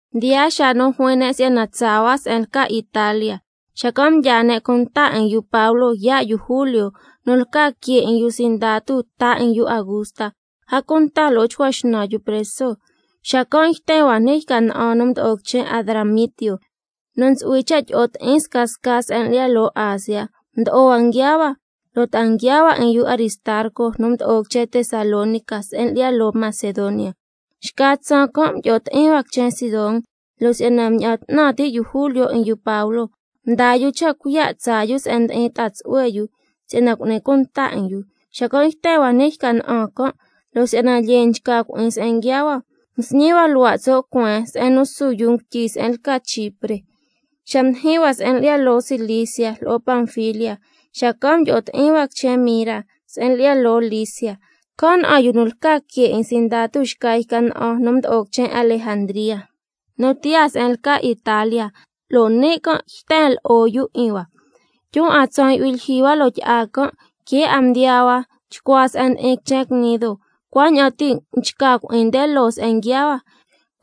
Mdiyaa xaa nu juin ne' si'yana tsaa hua se'en lca Italia, xacan' mdyaa ne' cunta 'in yu Pablo yaa' yu Julio, nu lca que 'in yu sindatu ta 'in yu Augusta, a cunta lo'o chcua xnan yu preso. Xacan' yten hua ni' yca na'an nu mdo'o quichen Adramitio, nu ntsu'hui cha' tyi'o ti'in scasca se'en lyi'ya loo Asia. Mdo'o hua nguiaa hua, lo' ta'a nguiaa hua 'in yu Aristarco nu mdo'o quichen Tesalónica se'en lyi'ya loo Macedonia. Xca tsaan can' mdyi'o ti'in hua quichen Sidón, lo' si'yana mña'an 'tnan ti' yu Julio 'in yu Pablo, mdaa yu cha' cuiya' tsaa yu se'en ndi'in ta'a tsu'hue yu si'yana cu'ni cunta 'in yu. Xacan' yten hua ni' yca na'an can', lo' si'yana lyee nchca cui'in se'en nguiaa hua, can' cha' msñi hua luhua' tso' cueen se'en su yuu ngutyi se'en lca Chipre. Xa mdijin hua se'en lyi'ya loo Cilicia lo'o Panfilia, xacan' mdyi'o ti'in hua quichen Mira se'en lyi'ya loo Licia. Can' na'an yu nu lca que 'in sindatu xca yca na'an nu mdo'o quichen Alejandría nu tiyaa se'en lca Italia, lo' ni' can' yten lo'o yu 'in hua. Tyun 'a tsaan yu'hui lyijyi hua loo tyi'a can', que' 'a mdiyaa hua chcua se'en ndi'in quichen Gnido, cuaña'an ti' nchca cui'in nde loo se'en nguiaa hua,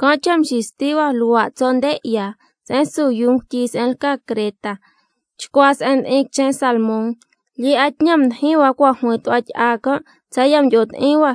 can' cha' mxisti hua luhua' tso' nde 'ya se'en su yuu ngutyi se'en lca Creta, chcua se'en ndi'in quichen Salmón. Lyee 'a tñan mdijin hua cua' juin tu'hua tyi'a can', tsaya' mdyi'o ti'in hua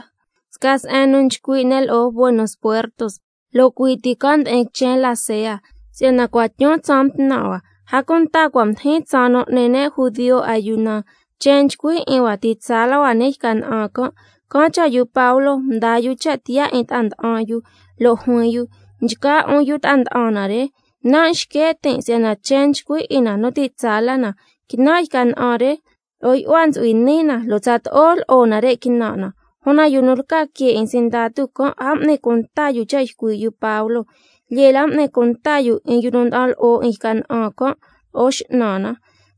sca se'en nu nchcui' ne' lo'o Buenos Puertos, lo' cui' ti can' ndi'in quichen Lasea. Si'yana cua' tyun tsaan mtnan' hua, a cunta cua' mdijin tsaan nu n'ni ne' judio ayuna, chen nchcui 'in hua ti' tsaa la hua ni' yca na'an can', can' cha' yu Pablo mdaa yu cha' tiyaa 'in ta'a nda'an yu, lo' juin yu: Nchgaa 'un yu ta'a nda'an na re, nan' xque' tin' si'yana chen nchcui 'in na nu ti' tsaa la na, quinan' yca na'an re lo'o yu'hua ntsu'hui ni' na, lo' tsato'o lo'o nare' quinan' na. Una yu nu lca que 'in sindatu can' a m'ni cunta yu cha' ycui' yu Pablo, lyee la m'ni cunta yu 'in yu nda'an lo'o 'in yca na'an can' lo'o x'nan na.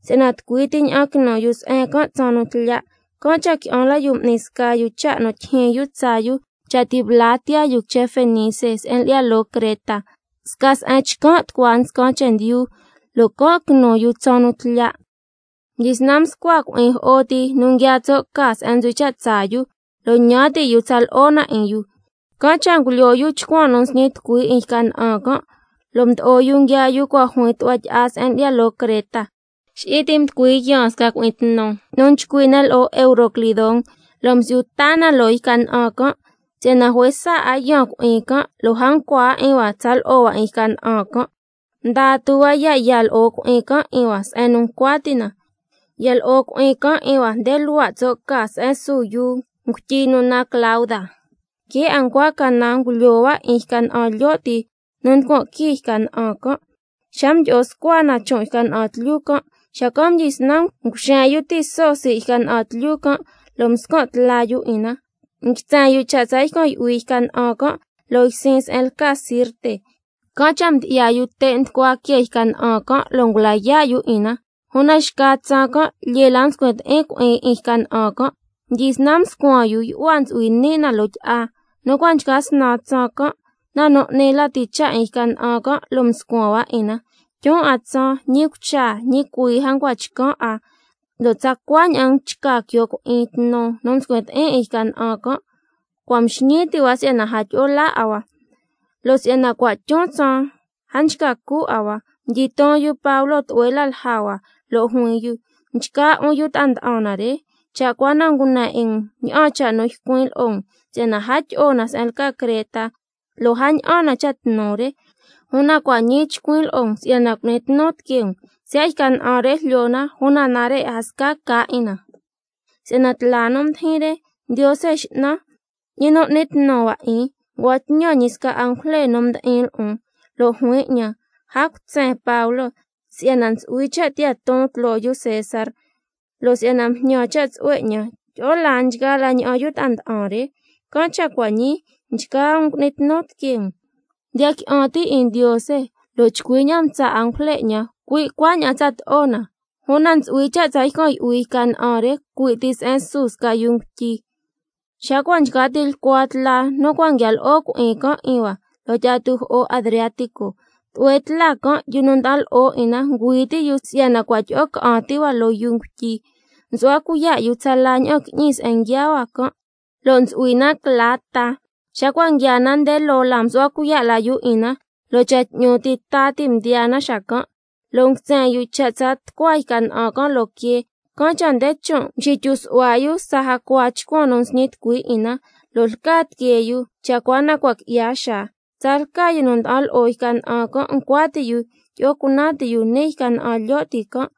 Si'yana tucui ti ña'an quinu yu se'en can' tsaan nu tlya', can' cha' qui'an la yu m'ni sca yu cha' nu tyijyin yu tsaa yu cha' ti' bla tiyaa yu quichen Fenice se'en lyi'ya loo Creta, sca se'en chcan' tucua nscan chendyu, lo' can' quinu yu tsaan nu tlya'. Mdyisnan mscua cui'in jo'o ti nu nguiaa tso' ca se'en ntsu'hui cha' tsaa yu, lo' ñan ti' yu tsa lo'o na 'in yu, can' cha' ngulyoo yu chcuan nu nsñi tucui 'in yca na'an can', lo' mdo'o yu nguiaa yu cua' juin tu'hua tyi'a se'en lyi'ya loo Creta. Xi'i ti mducui yaan sca cui'in tnu nu nchcui' ne' lo'o Euroclidón, lo' msi'yu taa na loo yca na'an can'. Si'yana juesa 'a yaan cui'in can', lo' a ncua 'a 'in hua tsa lo'o hua 'in yca na'an can', mdaa tu hua ya' ya lo'o cui'in can' 'in hua se'en nu ncua ti' na. Ya lo'o cui'in can' 'in hua nde luhua' tso' ca se'en su yuu ngutyi nu naan Clauda, que' 'a ncua canan ngulyoo hua 'in yca na'an lyo' ti nu nducuan quii yca na'an can'. Xa mdyi'o scua na chon' yca na'an tlyu can', xacan' mdyisnan nguxen yu tiso sii' yca na'an tlyu can' lo' mscan' tla yu 'in na. Nguitsen yu cha' tsa ycan' yu'hui yca na'an can' loo ysin se'en lca Sirte, can' cha' mdyi'ya yu te' nducua que yca na'an can', lo' ngula yaa' yu 'in na. Una xca tsaan can' lyee la mscuin ti'in cui'in 'in yca na'an can', xacan' mdyisnan mscuan yu yu'hua ntsu'hui ni' na loo tyi'a. Nu cua' nchca snan tsaan can', na nu 'ni lati cha' 'in yca na'an can' lo' mscuan hua 'in na. Tyun 'a tsaan, ñi cucha ñi cuii a ncua chcan' 'a, lo' tsacua ña'an nchca quio cui'in tnu nu mscuin ti'in 'in yca na'an can', cua' mxñii ti' hua si'yana a tyi'o laa 'a hua. Si'yana cua' tyun tsaan a nchca cu 'a hua, mdyiton yu Pablo tlu'hue la lja hua, lo' juin yu: Nchgaa 'un yu ta'a nda'an na re, cha' cua na ngune 'in um ña'an cha' nu ycuin' lo'o um si'yana a tyi'o na se'en lca Creta, lo' a ña'an na cha' tnu re. Una cua' ñii chcuin' lo'o um si'yana cu'ni tnu tiquee um, siya' yca na'an re jlyo na una nare' a sca ca 'in na. Si'yana tla nu mdijin re, Ndiose X'nan, ñi nu ngui'ni tnu hua 'in, ngua'an tñan ñi sca angujle nu mdi'in lo'on. Lo' juin 'ñan: A cutsen Pablo, si'yana ntsu'hui cha' tiyaa ton tloo yu César, lo' si'yana mjñan cha' tsu'hue 'ñan, tyi'o laa nchgaa la ña'an yu ta'a nda'an re. Can' cha' cua' ñii, nchgaa um cu'ni tnu tiquee um, si'yana ndiya qui'an tin' 'in Ndiose, lo' chcui ña'an mtsa' angujle 'ñan, cui' cuaña'an tsato'o na. Una ntsu'hui cha' tsa ycan' yu'hui yca na'an re cui' ti se'en su sca yuu ngutyi. Xa cua' nchca tilcua tla nu cua' nguia lo'o cui'in can' 'in hua loo tyi'a tujo'o Adriático, tlu'hue tla can' yu nu nda'an lo'o 'in na ngüi ti' yu si'yana cua' tyi'o ca'an ti hua loo yuu ngutyi. Xacan' msu'hua cuiya' yu tsala ña'an qui'ñi se'en nguiaa hua can', lo' ntsu'hui na cla ta. Xa cua' nguiaa na nde loo la msu'hua cuiya' la yu 'in na, lo' cha' 'tñu ti ta ti' ndiyaa na xacan'. Lo' nguitsen yu cha' tsa tucua yca na'an can' loo quee, can' cha' nde chon' mxityu su'hua yu tsa jacua chcuan nu nxñi tucui 'in na, lo' lca tiquee yu cha' cua na cua' qui'ya xaa. Tsalca yu nu nda'an lo'o yca na'an can' ncua ti' yu tyi'o cunan ti yu ni' yca na'an lyo' ti can',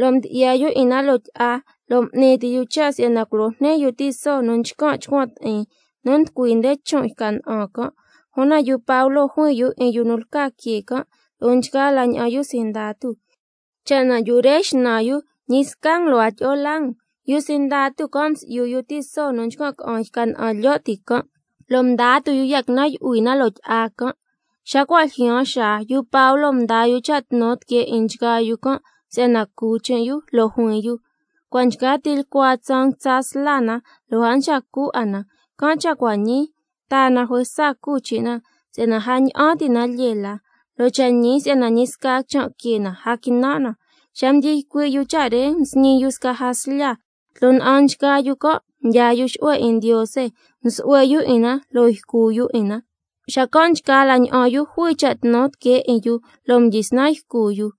lo' mdyi'ya yu 'in na loo tyi'a, lo' m'ni ti yu cha' si'yana culo jni yu tiso nu nchcan' chcuan ti'in nu nducui nde chon' yca na'an can'. Una yu Pablo juin yu 'in yu nu lca que can' lo'o nchgaa la ña'an yu sindatu: Cha' na yu re xnan yu, ñi sca um lo' a tyi'o laa um. Yu sindatu can' msi'yu yu tiso nu nchcan' ca'an yca na'an lyo' ti can', lo' mdaa tu yu ya' quinan' yu'hui na loo tyi'a can'. Xa cua' ljyaan xaa, yu Pablo mdaa yu cha' tnu tiquee 'in nchgaa yu can' si'yana cu chin' yu, lo' juin yu: Cua' nchca tilcua tsaan nguitsa sla na, lo' a nchca cu 'a na. Can' cha' cua' ñii, taa na juesa cu chin' na si'yana a ña'an ti' na lyee la, lo' cha' ñi si'yana ñi sca quichan' que na a quinan' na. Xa mdyi ycui' yu cha' re msñi yu sca jaslya, tloo na'an nchgaa yu can' mdyaa yu xu'hue 'in Ndiose, msu'hue yu 'in na lo' ycu yu 'in na. Xacan' nchgaa la ña'an yu jui cha' tnu tiquee 'in yu, lo' mdyisnan ycu yu.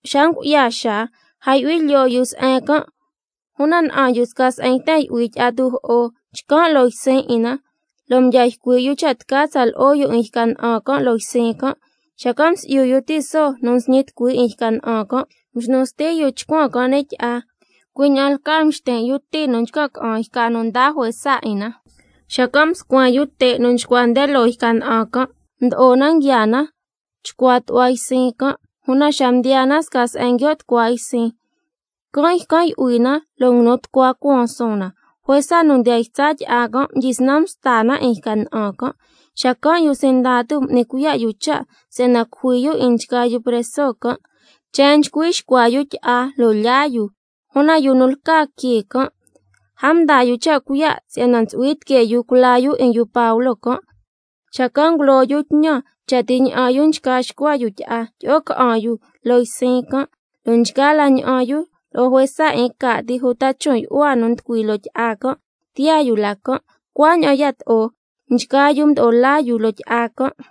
Xa ngu'ya xaa, a yu'hui lyoo yu se'en can', una na'an yu sca se'en yten yu'hui tyi'a tujo'o, chcan' loo ysin 'in na, lo' mdya ycui' yu cha' tca tsa lo'o yu 'in yca na'an can' loo ysin can'. Xacan' msi'yu yu tiso nu nsñi tucui 'in yca na'an can', mxnu sti yu chcuan can' ni' tyi'a, cui' ña'an lcaa mxtin' yu ti nu nchcan' ca'an yca nu nda juesa 'in na, xacan' mscuen yu te' nu chcua nde loo yca na'an can', mdo'o na nguiaa na chcua tu'hua ysin can'. Una xa mdiyaa na sca se'en nguio' tucua ysin, can' ycan' yu'hui na lo' nguinu tucua cuaan suun na, juesa nu ndiyan ytsa tyi'a can' mdyisnan msta na 'in yca na'an can'. Xacan' yu sindatu m'ni cuiya' yu cha' si'yana cujui yu 'in nchgaa yu preso can', si'yana a xcua yu tyi'a lo' lyaa yu. Una yu nu lca que can' a mdaa yu cha' cuiya' si'yana ntsu'hui tiquee yu culaa yu 'in yu Pablo can'. Xacan' ngulo yu tñan cha' ti ña'an yu nchca nxcua yu tyi'a, tyi'o ca'an yu loo ysin can', lo' nchgaa la ña'an yu lo'o juesa 'in ca' ti uta chon' yu'hua nu nducui loo tyi'a can' tiyaa yu la can'. Cuaña'an yato'o nchgaa yu mdo'o laa yu loo tyi'a can'.